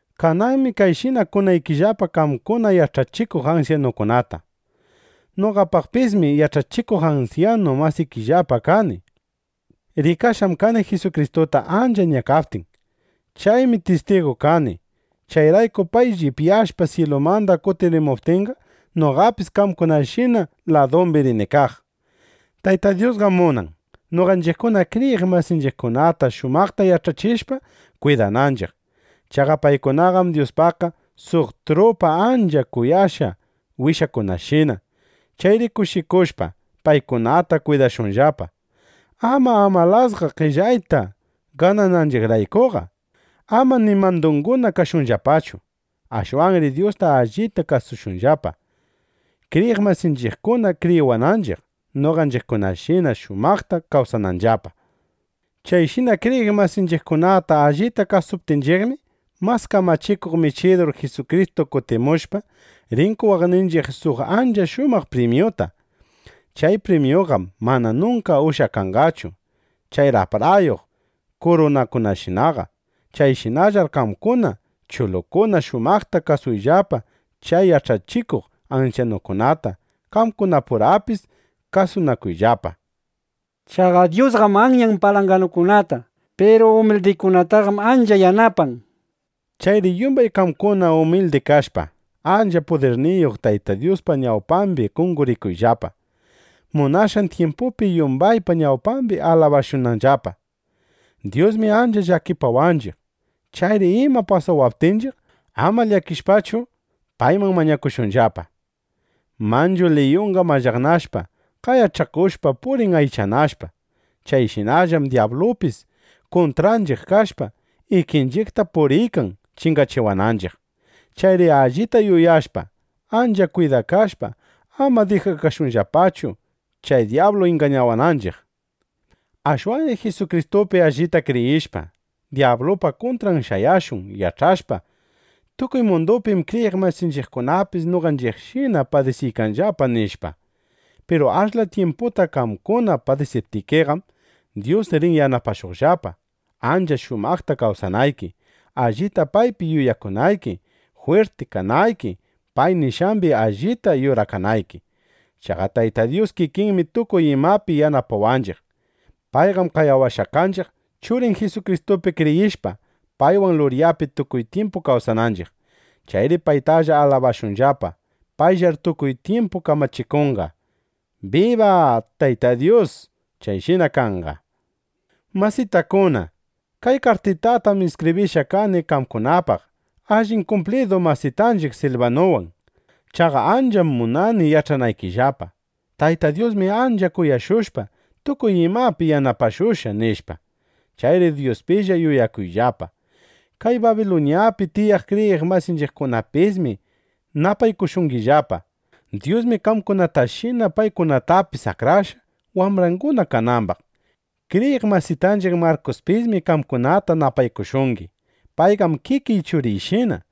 Kananmi kayshina kunaykillapa qamkuna yach'achikuq ansyanukunata. Noqapismi yach'achikuq ansyanu masikillapa kani. Rikashqam kani Jisukristuta ancha ñakaptin. Chaymi tistigu kani. Chayrayku pay llipyashpa syilumanda kutirimuptinqa, noqapis qamkunashina ladumbi rini kaq. Tayta Dyusqam munan, noqanchiqkuna kriyiq masinchiqkunata shumaqta yach'achishpa kwidananchiq. Chaqa paykunaqam Dyuspaqqa suq trupa ancha kuyashqa wishakunashina. Chayri kushikushpa, paykunata kwidashunllapa; ama amalasqa qellayta ganananchiqraykuqa. Amar ni mandunguna kashunllapachu. Ashwanri Dyusta allita kasushunllapa, kriyiq masinchiqkuna rikawaqninchiq, noqanchiqkunashina shumaqta kawsananllapa. Chayshina kriyiq masinchiqkunata allita kwidaptinchiqmi, mas kamachikuq Michidur Jisukristu kutimushpa, rin qowaqninchiq suq ancha shumaq primyuta. Chay primyuqam mana nunka ushyakanqachu chay raprayuq kurunakunashinaqa. Chayshinallar qamkuna chulukuna shumaqta kasuyllapa chay yach'achishuq ansyanukunata. Qamkunapurapis kasunakuyllapa. Chaqa Dyusqam anyan palanganukunata. Piru umildikunataqam ancha yanapan. Chayri yumbay qamkuna umildi kashpa, ancha pudirniyuq Tayta Dyuspa ñawpambi qonqorikuyllapa, munashqan tyimpupi yumbaypa ñawpambi alabashunanllapa. Dyusmi ancha llakipawanchiq. Chayri ima pasawaptinchiq, ama llakishpachu, payman mañakushunllapa. Manchu liyunqa mallaqnashpa, qayach'akushpa purin aychanashpa. Chayshinallam dyablupis kuntranchiq kashpa, ikinchiqta puriykan chingachiwananchiq. Chayri allita yuyashpa, ancha kwidakashpa, ama dijashunllapachu, chay dyablu ingañawananchiq. Ashwanri Jisukristupi allita kriyishpa, dyablupa kuntran shayashun yach'ashpa: Tukuy mundupim kriyiq masinchiqkunapis noqanchiqshina padisiykanllapa, nishpa. Piru ashla tyimputa qamkuna padisiptikiqam, Dyus rin yanapashuqllapa, ancha shumaqta kawsanayki, allita paypi yuyakunayki, jwirti kanayki, pay nishqambi allita yurakanayki. Chaqa Tayta Dyus kikinmi tukuy imapi yanapawanchiq. Payqam qayawashqa kanchiq, Churin Jisukristupi kriyishpa, paywan luryapi tukuy tyimpu kawsananchiq. ¡Chayri paytalla alabashunllapa! ¡Payllar tukuy tyimpu kamachikunqa! ¡Biba Tayta Dyus! Chayshina kanqa. Masitakuna, kay kartitatam iskibrishqa kani qamkunapaq allin kumplidu masitanchiq Silbanuwan. Chaqa ancha munani yach'anaykillapa: Tayta Dyusmi ancha kuyashushpa, tukuy imapi yanapashushqa, nishpa. Chayri Dyuspilla yuyakuyllapa. Kay Babiluñapi tiyaq kriyiq masinchiqkunapismi napaykushungillapa. [Nuta: Babiluñach'i munanman niyta Rruma.] Dyusmi qamkunatashina paykunatapis akrashqa, wambranguna kanambaq. Kriyiq masitanchiq Markuspismi qamkunata napaykushungi. Payqam kikiy churiyshina.